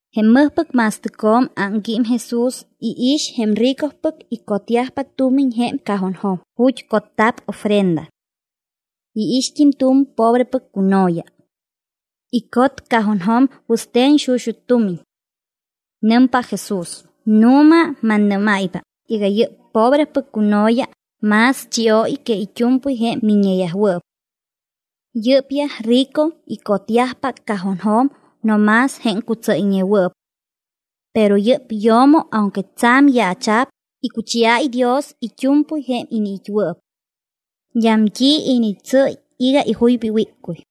Jém mɨjpɨc ma̱stɨcjo̱m ámquím Jesús, iix jém ricopɨc icotyajpa tumiñ jém cajonjo̱m ju̱t́ cotta̱p ofrenda. Iixt́im tu̱m pobrepɨc cuno̱ya. Icot cajonjo̱m wɨste̱n xuxut́ tumiñ. Nɨmpa Jesús: —Nu̱ma, mannɨ́máypa iga yɨ́p pobrepɨc cuno̱ya más chióy que it́u̱mpɨy jém miññeyajwɨɨp. Yɨ́pyaj rico icotyajpa cajonjo̱m no más jém cutsɨ́yñewɨɨp. Pero yɨ́p yo̱mo aunque tsa̱m yaacha̱p, icuchiáy Dios it́u̱mpɨy jém iniit́wɨɨp. D́am t́i initsɨ́y iga ijuypa iwíccuy.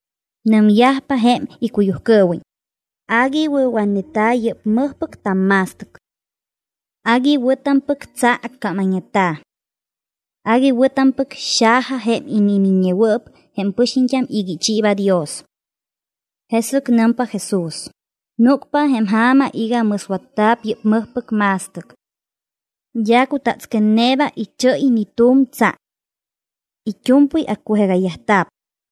Nɨmyajpa jém icuyujcɨɨwiñ: —Agui wɨ̱watneta̱ yɨ́p mɨjpɨc tamma̱stɨc. Agui wɨ̱tampɨc tsa accamayñeta̱. Agui wɨ̱tampɨc xaja jém inimiññewɨɨp jém pɨxiñt́am iga ichiiba Dios. Jesɨc nɨmpa Jesús: —Núcpa jém ja̱ma iga mɨswatta̱p yɨ́p mɨjpɨc ma̱stɨc. D́a cutatsquetneeba ichɨ́y ni tu̱m tsa. It́u̱mpɨy accujegayyajta̱p.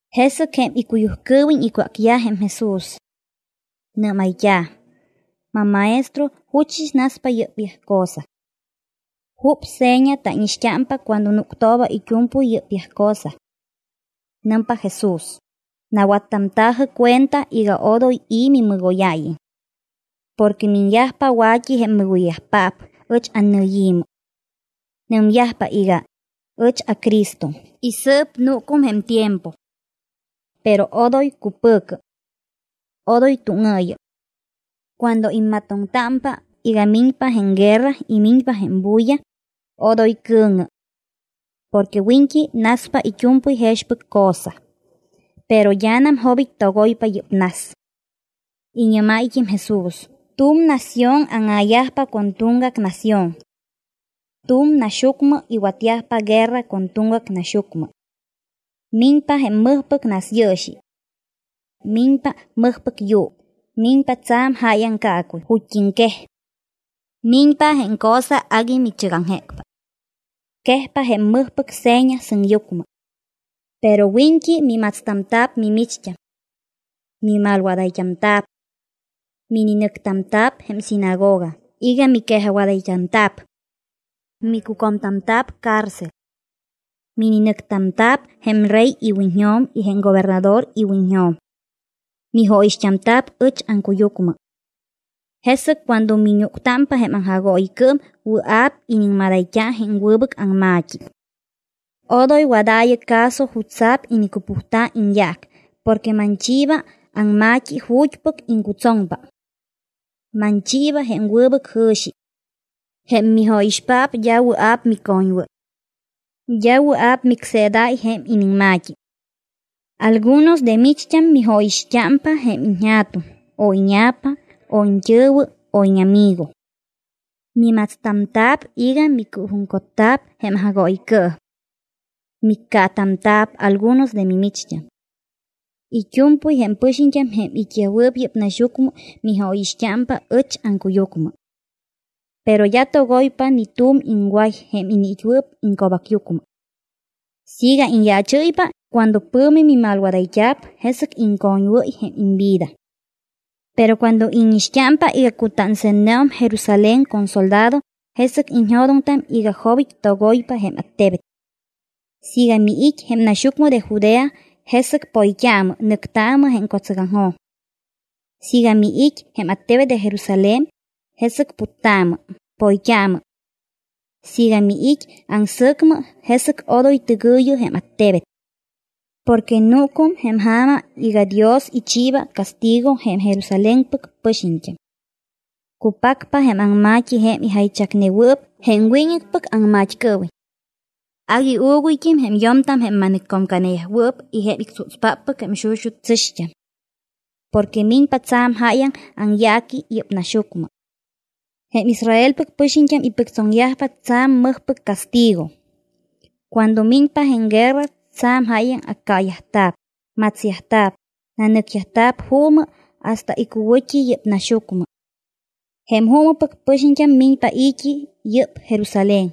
Jesɨc jém icuyujcɨɨwiñ icwácyaj jém Jesús. Nɨ́mayt́a̱: —¿MamMaestro, juchɨs naspa yɨ́pyaj cosa? ¿Jup seña tánixt́ampa cuando núctooba it́u̱mpɨy yɨ́pyaj cosa? Nɨmpa Jesús: —Nawattamta̱jɨ cuenta iga odoy i̱ mimɨgóyáyiñ. Porque miñyajpa wa̱t́i jém mɨgoyyajpaap ɨch annɨyi̱mɨ. Nɨmyajpa iga: “Ɨch aCristo”; y “Sɨɨp núcum jém tiempo.” Pero odoy cupɨ̱cɨ. Odoy túŋɨɨyɨ. Cuando immatoŋtámpa iga miñpa jém guerra y miñpa jém bulla, odoy cɨ̱ŋɨ. Porque wiñt́i naspa it́u̱mpɨy jexpɨc cosa. Pero d́anam jobit́ togoypa yɨ́p nas. Iñɨ́máyt́im Jesús: —Tu̱m nación áŋa̱yajpa con tuŋgac nación. Tu̱m naxyucmɨ iwatyajpa guerra con tuŋgac naxyucmɨ. Miñpa jém mɨjpɨc nasyɨɨxi. Miñpa mɨjpɨc yuu, miñpa tsa̱m jáyaŋ caacuy ju̱t́iŋquej. Miñpa jém cosa agui michɨgaŋjécpa. Quejyajpa jém mɨjpɨc seña sɨŋyucmɨ. ’Pero wiñt́i mimatstamta̱p mimicht́am. Mimalwadayt́amta̱p. Mininɨctamta̱p jém sinagoga iga miquejajwadayt́amta̱p. MicUcomtamta̱p cárcel. Mininɨctamta̱p jém rey iwiñjo̱m y jém gobernador iwiñjo̱m. Mijóyixt́amta̱p ɨch aŋcuyucmɨ. Jesɨc cuando miñúctámpa jém aŋjagooyicɨɨm wɨa̱p iniŋmadayt́a jém wɨbɨc aŋma̱t́i. Odoy wadaayɨ caso jutsa̱p inicupujta̱ iñyaac, porque manchiiba aŋma̱t́i ju̱t́pɨc iŋcutsoŋpa. Manchiiba jém wɨbɨc jɨ̱xi. Jém mijóyixpaap d́a wɨa̱p micoñwɨ́y. D́a wɨa̱p micseedáy jém iniŋma̱t́i. Algunos de micht́am mijóyixt́ámpa jém iñja̱tuŋ o íña̱pa o iñt́ɨ̱wɨ o íñamigo. Mimatstamta̱p iga micɨɨjuŋcotta̱p jém aŋjagooyicɨɨm. Miccaatamta̱p algunos de mimicht́am. It́u̱mpɨy jém pɨxiñt́am jém it́yajwɨɨp yɨ́p naxyucmɨ mijóyixt́ámpa ɨch aŋcuyucmɨ. Pero d́a togoypa ni tu̱m iŋway jém iniit́wɨɨp iŋco̱bacyucmɨ. Siiga iñyaachɨ́ypa cuando pɨ̱mi mimalwadayt́a̱p, jesɨc iŋcoñwɨ́y jém imvida. ’Pero cuando íñixt́ámpa iga cutánse̱tneum Jerusalén con soldado, jesɨc iñjo̱doŋtam iga jobit́ togoypa jém attebet. Siiga miit́ jém naxyucmɨ de Judea, jesɨc poyt́aamɨ, nɨctaamɨ jém co̱tsɨgaŋjo̱m. Siiga miit́ jém attebet de Jerusalén, jesɨc puttaamɨ, poyt́aamɨ. Siiga miit́ aŋsɨ̱cmɨ, jesɨc odoy tɨgɨ̱yɨ jém attebet. Porque núcum jém ja̱ma iga Dios ichiiba castigo jém Jerusalénpɨc pɨxiñt́am. Cupacpa jém aŋma̱t́i jém ijaychacnewɨɨp jém wiñɨcpɨc aŋmat́cɨɨwiñ. Agui uuguyt́im jém yo̱mtam jém ma̱nɨccomcanewɨɨp y jém ictsútspáppɨc jém xuxut́ tsɨ̱xt́am. Porque miñpa tsa̱m jáyaŋ aŋyaaqui yɨ́p naxyucmɨ. Jém Israelpɨc pɨxiñt́am ipɨctsoŋyajpa tsa̱m mɨjpɨc castigo. Cuando miñpa jém guerra tsa̱m jáyaŋ accaayajta̱p, matsyajta̱p, nanɨcyajta̱p juumɨ hasta icuwɨ̱t́i yɨ́p naxyucmɨ. Jém juumɨpɨc pɨxiñt́am miñpa i̱t́i yɨ́p Jerusalén,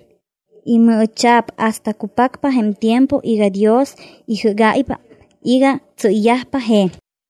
imɨɨcha̱p hasta cupacpa jém tiempo iga Dios ijɨ́gáypa iga tsɨ́yyajpa je̱m.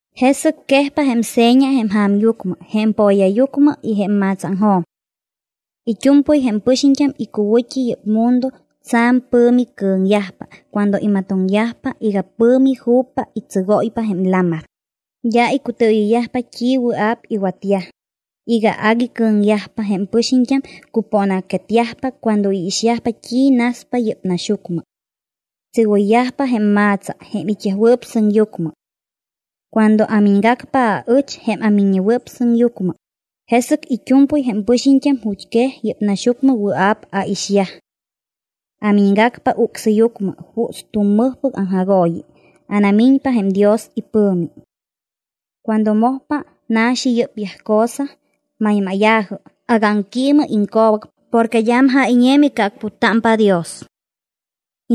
’Jesɨc quejpa jém seña jém ja̱myucmɨ, jém po̱yayucmɨ y jém ma̱tsaaŋjo̱m. It́u̱mpɨy jém pɨxiñt́am icuwɨ̱t́i yɨ́p mundo tsa̱m pɨ̱mi cɨ̱ŋyajpa cuando imatoŋyajpa iga pɨ̱mi ju̱pa y tsɨgóypa jém lamar. D́a icutɨɨyɨyyajpa t́i wɨa̱p iwatyaj. Iga agui cɨ̱ŋyajpa, jém pɨxiñt́am cupóna̱quetyajpa cuando iixyajpa t́i naspa yɨ́p naxyucmɨ. Tsɨgoyyajpa jém ma̱tsa jém it́yajwɨɨp sɨŋyucmɨ. Cuando amiñgacpa, aɨch jém aMiññewɨɨp Sɨŋyucmɨ, jesɨc it́u̱mpɨy jém pɨxiñt́am ju̱t́quej yɨ́p naxyucmɨ wɨa̱p aixyaj. Amiñgacpa ucsɨyucmɨ juuts tu̱m mɨjpɨc aŋjagooyi, anamiñpa jém Dios ipɨ̱mi. Cuando mojpa na̱xi yɨ́pyaj cosa, maymáya̱jɨ, agámquiimɨ iŋco̱bac, porque d́am jáyñe micɨacputtámpa Dios.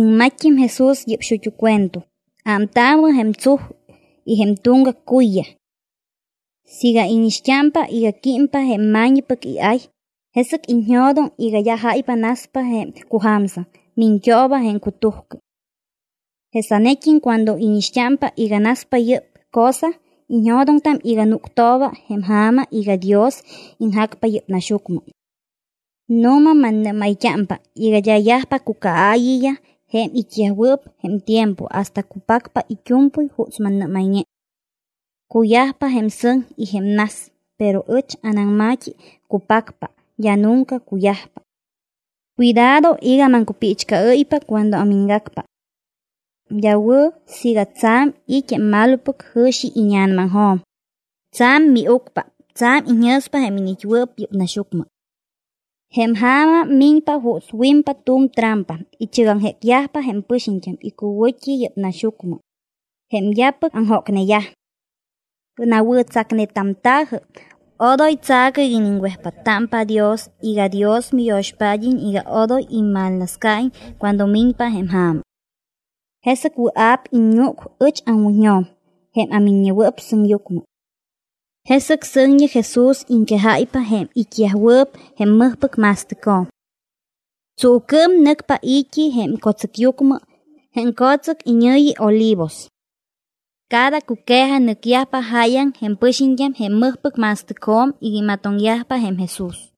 Iŋmatt́im Jesús yɨ́p xut́u cuento: —Ámtaamɨ jém tsuj y jém tuŋgac cuyyaj. Siiga íñixt́ámpa iga químpa jém ma̱ñipɨc iay, jesɨc iñjo̱doŋ iga d́a jáypa naspa jém cuja̱msɨŋ, miñt́ooba jém cutujcɨ. Jesanet́im cuando íñixt́ámpa iga naspa yɨ́p cosa, iñjo̱doŋtam iga núctoobam jém ja̱ma iga Dios iñjacpa yɨ́p naxyucmɨ. ’Nu̱ma mannɨ́mayt́ámpa iga d́a yajpa cucaaayiyaj jém it́yajwɨɨp jém tiempo hasta cupacpa it́u̱mpɨy juuts mannɨ́mayñe. Cuyajpa jém sɨŋ y jém nas, pero ɨch anaŋma̱t́i cupacpa, d́a nunca cuyajpa. ’Cuidado iga maŋcupiichcɨɨ́ypa cuando amiñgacpa. D́a wɨ̱ siiga tsa̱m it́ jém malopɨc jɨ̱xi íña̱namaŋjo̱m, tsa̱m miucpa, tsa̱m iñjɨ̱spa jém iniit́wɨɨp yɨ́p naxyucmɨ. Jém ja̱ma miñpa juuts wimpa tu̱m trampa, ichɨgaŋjécyajpa jém pɨxiñt́am icuwɨ̱t́i yɨ́p naxyucmɨ, jém d́apɨc aŋjócneyaj. Nawɨ̱tsacnetamta̱jɨ, odoy tsa̱cɨ iga iniŋwejpáttámpa Dios iga Dios miyo̱xpád́iñ iga odoy immalnascaiñ cuando miñpa jém ja̱ma. Jesɨc wɨa̱p iññúc ɨch aŋwiñjo̱m jém aMiññewɨɨp Sɨŋyucmɨ. Jesɨc sɨŋñi Jesús iŋquejáypa jém it́yajwɨɨp jém mɨjpɨc ma̱stɨcjo̱m. Tsuucɨɨm nɨcpa i̱t́i jém co̱tsɨcyucmɨ, jém co̱tsɨc iñɨ̱yi Olivos. Cada cuque̱ja nɨcyajpa jáyaŋ jém pɨxiñt́am jém mɨjpɨc ma̱stɨcjo̱m iga imatoŋyajpa jém Jesús.